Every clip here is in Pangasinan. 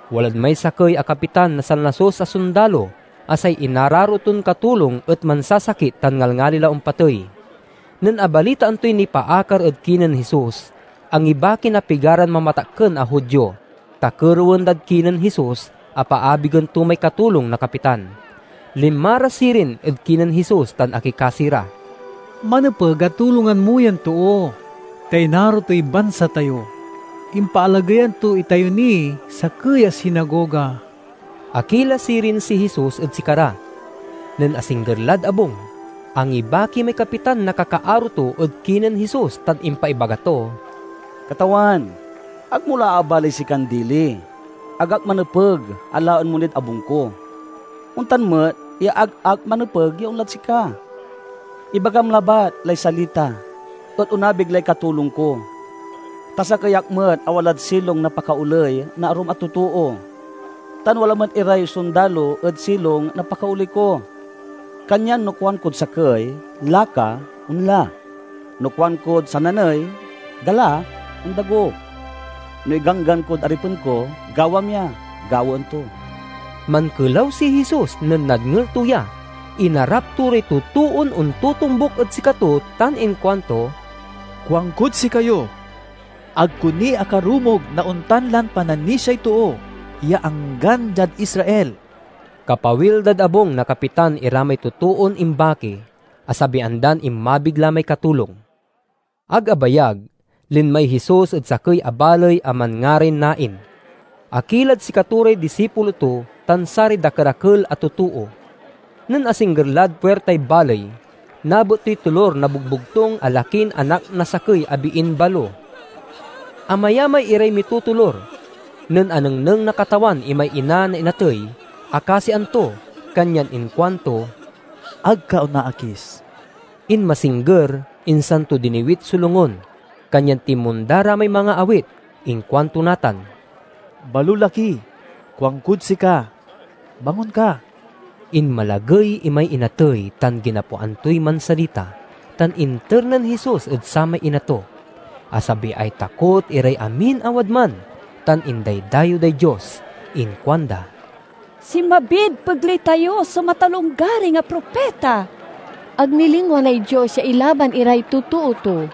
Walad may sakey a kapitan na sanlasus a sondalo a say inararo ton katulong et mansasakit tan ngalngali la ompatey. Nen abalitaan toy nipaakar ed kinen Jesus, angibaki na pigaran mamatakken a Judio, ta kerewen dad kinen Jesus a paabigen to may katulong na kapitan. Linma ra sirin ed kinen Jesus tan akikasi ra, "Manepeg a tulongan mo yan too, ta inaro toy a bansa tayo. Impaalageyan to itayo niy sakey a sinagoga." Akila sirin si Jesus ed sikara. Nen asingger lad abung, angibaki may kapitan na kakaaro to ed kinen Jesus tan impaibaga to, "Katawan, ag mo la aabalaey sikan dili. Ag ak manepeg a laen mo nid abung ko. Ontan met ya ag ak manepeg ya onlad sika. Ibagam labat lay salita, et onabig lay katulong ko. Ta sakey ak met a walad silong na pakaoley na arum a totoo, tan wala met iray sondalo ed silong na pakaoley ko. Kanyan no kuankod sakey, 'Laka!' onla; no kuankod sananey, 'Gala!' ondago. No iganggan kod aripen ko, 'Gawam ya!' gawaen to." Mankelaw si Jesus nen nadngel to ya. Inarap to ray totoon ontotombuk ed sikato tan inkuanto, "Kuankod sikayo: ag ko ni akarumog na ontan lan pananisiay too, ya anggan diad Israel!" Kapawil dad abung na kapitan ira may totoon imbaki, asabian dan inmabig la may katulong. Ag abayag, linmay Jesus ed sakey a baley a manngaray Nain. Akilad sikato ray disipulo to tan saray dakerakel a totoo. Nen asingger lad puirtay baley, nabet toy tolur na bogbogtung a lakin anak na sakey a biin balo. Amayamay iray mitotolur. Nen anengneng na Katawan imay ina na inatey akasian to, kanyan inkuanto, "Ag ka onaakis." Inmasingger, insan to diniwit so longun, kanyan tinmonda ra may mangaawit. Inkuanto natan, "Balolaki, kuankod sika, bangon ka!" Inmalagey imay inatey tan ginapoan toy mansalita, tan inter nen Jesus ed samay ina to. Asabiay takot iray amin a wadman, tan indaydayew day Dios. Inkuanda, "Sinmabid pegley tayo so matalonggaring a propita! Ag nilingwanay Dios ya ilaban iray totoo to!"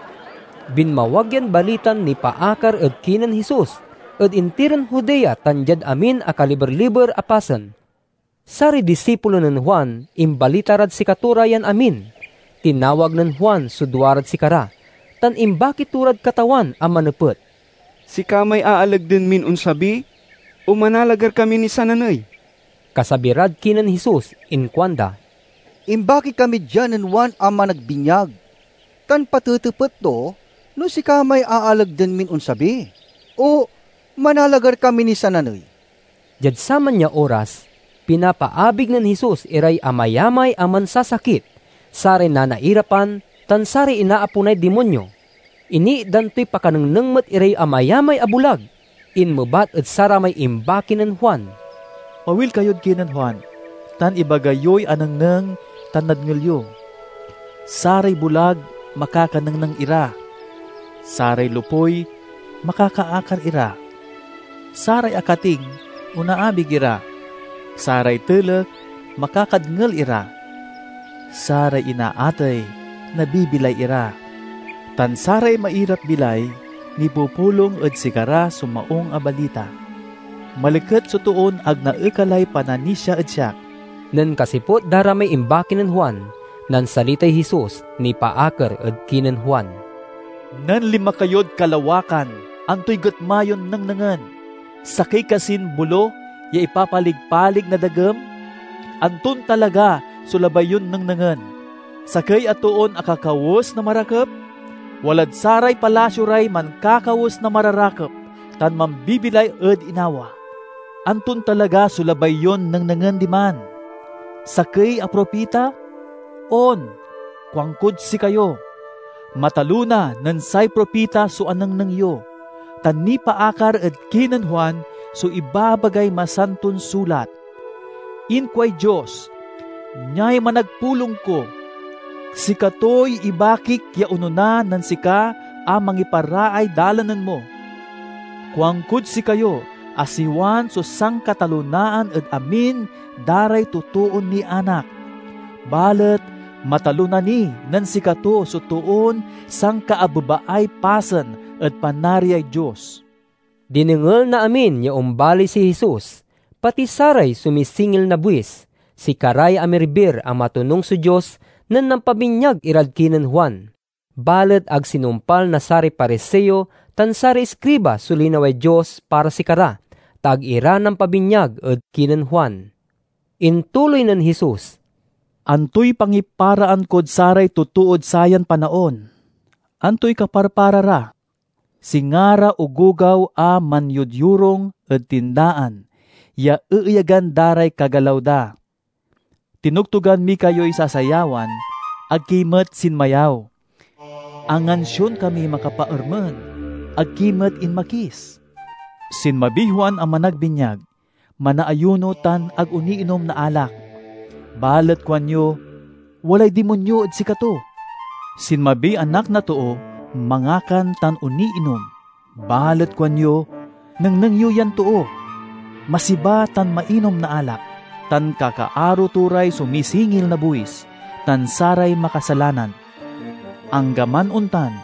Binmawag yan balitan nipaakar ed kinen Jesus ed intiron Judea tan diad amin a kaliber-liber a pasen. Saray disipulo nen Juan imbalita rad sikato ra yan amin. Tinawag nen Juan so duarad sikara, tan imbaki to rad Katawan a manepet, "Sika may aalagden min onsabi, o manalagar kami niy sananey?" Kasabi rad kinen Jesus inkuanda, "Imbaki kami dia nen Juan a Managbinyag tan patetepet to no sika may aalagden min onsabi o manalagar kami niy sananey." Diad saman ya oras, pinapaabig nen Jesus iray amayamay a mansasakit, saray nanairapan, tan saray inaaponay dimonyo. Iniitdan toy pakanengneng met iray amayamay a bulag. Inmebat ed saramay imbaki nen Juan, "Pawil kayod kinen Juan tan ibaga yoy anengneng tan nadngel yo: saray bulag makakanengneng ira, saray lopuy makakaakar ira, saray akating onaabig ira, saray telek makakadngel ira, saray inaatey nabibilay ira, tan saray mairap-bilay nipupulong ed sikara so Maung a Balita. Maliket so toon ag naekalay pananisia ed siak!" Nen kasiput da ra may imbaki nen Juan, nansalitay Jesus nipaakar ed kinen Juan, "Nen linma kayod kalawakan, antoy getma yon nengnengen? Sakey kasin bolo ya ipapalig-palig na dagem? Anton talaga so labay yon nengnengen? Sakey a toon akakawes na marakep? Walad saray palasio ray mankakawes na mararakep tan mambibilay ed inawa! Anton talaga so labay yon nengnengen diman? Sakey a propita? On, kuankod sikayo, matalona nen say propita so anengneng yo. Ta nipaakar ed kinen Juan so ibabagay Masanton Sulat: 'Inkuay Dios, Niay managpulong ko. Sikatoy ibakik ya onona nen sika a mangiparaay dalanen mo!' Kuankod sikayo a si Juan so sankatalonaan ed amin da ray totoon nianak, balet matalona ni nen sikato so toon sankaabebaay pasen ed Panariay Dios." Dinengel na amin ya ombaley si Jesus, pati saray sumisingil na buis. Sikaray amirbir a matonung so Dios nen nampabinyag irad kinen Juan. Balet ag sinumpal na saray Pariseo tan saray iskriba so linaway Dios para sikara, ta ag ira nampabinyag ed kinen Juan. Intuloy nen Jesus, "Antoy pangiparaan kod saray totood sayan panaon? Antoy kaparpara ra? Singa ra ogogaw a manyodyorung ed tindaan ya eeyagan da ray kagalaw da, 'Tinogtogan mi kayoy sasayawan, ag ki met sinmayaw; angansion kamiy makapaermen, ag ki met inmakis!' Sinmabiy Juan a Managbinyag, manaayuno tan ag oniinom na alak, balet kuanyo, 'Walay dimonyo ed sikato!' Sinmabiy Anak a Too, mangakan tan oniinom, balet kuanyo, 'Nengneng yo yan too. Masiba tan mainom na alak, tan kakaaro to ray sumisingil na buwis tan saray makasalanan!' Anggaman ontan,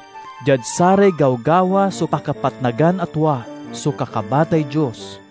diad saray gawgawa so pakapatnagan a tua so kakabatay Dios."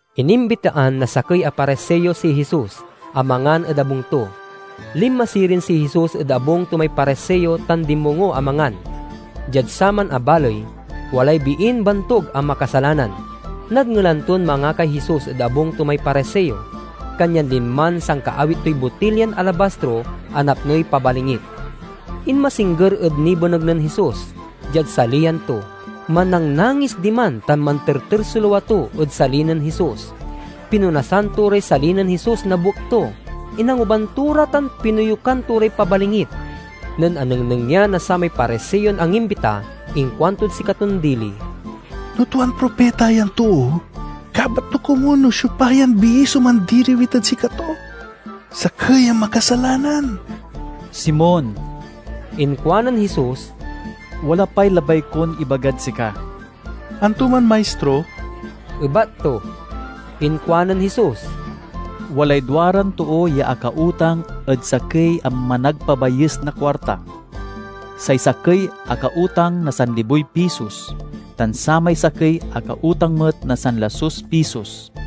Inimbitaan na sakey a Pariseo si Jesus a mangan ed abung to. Linma sirin si Jesus ed abung to may Pariseo tan dinmongo a mangan. Diad saman a baley, walay biin bantug a makasalanan. Nadngelan ton mangakay Jesus ed abung to may Pariseo, kanyan linman sankaawit toy botilyan alabastro a napnoy pabalingit. Inmasingger ed nibeneg nen Jesus, diad saliyan to. Mannangnangis diman tan manterter so lua to ed sali nen Jesus. Pinonasan to ray sali nen Jesus na buek to, inanguban to ra tan pinoyukan to ray pabalingit. Nen anengneng ya na samay Pariseon angimbita, inkuantod sikaton dili, "No tuan propita yan too, kabat to komun no siopa yan bii so mandiriwit ed sikato—sakey a makasalanan!" "Simon," inkuanen Jesus, "wala pay labay kon ibagad sika." "Anto man, Maistro?" ebat to. Inkuanen Jesus, "Walay duaran too ya akautang ed sakey a managpabayes na kuarta. Say sakey akautang na sanliboy pisos tan samay sakey akautang met na sanlasus pisos.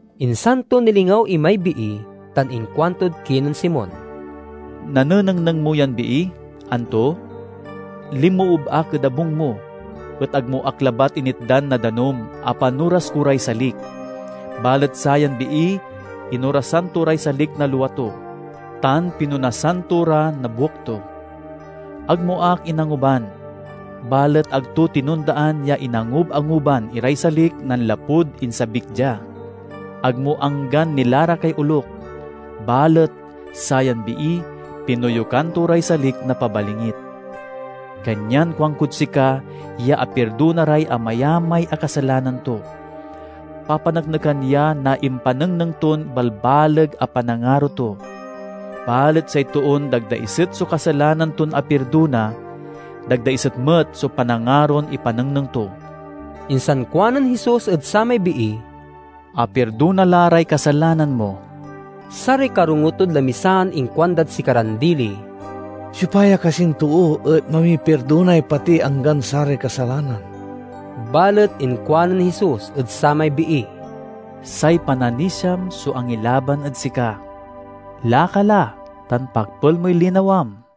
Insan to nilingaw imay bii tan inkuantod kinen Simon, "Nanenengneng mo yan bii, anto? Linmoob ak ed abung mo, et ag mo ak labat initdan na danum a panoras ko ray salik. Balet sayan bii inorasan to ray salik na lua to, tan pinonasan to ra na buek to. Ag mo ak inanguban, balet ag to tinondaan ya inangub-anguban iray salik nanlapud insabik dia. Ag mo anggan nilarakay olok, balet sayan bii pinoyukan to ray salik na pabalingit. Kanyan kuankod sika ya apirdona ray amayamay a kasalanan to; papaneknekan ya na impanengneng ton balbaleg a panangaro to. Balet say toon dagdaiset so kasalanan ton apirdona, dagdaiset met so panangaron ipanengneng to." Insan kuanen Jesus ed samay bii, "Apirdona la ray kasalanan mo." Saray karongo tod lamisaan inkuandad sikaran dili, "Siopa ya kasin too et mamipirdonay pati anggan saray kasalanan?" Balet inkuanen Jesus ed samay bii, "Say pananisiam so angilaban ed sika. Laka la, tan pakpel moy linawam."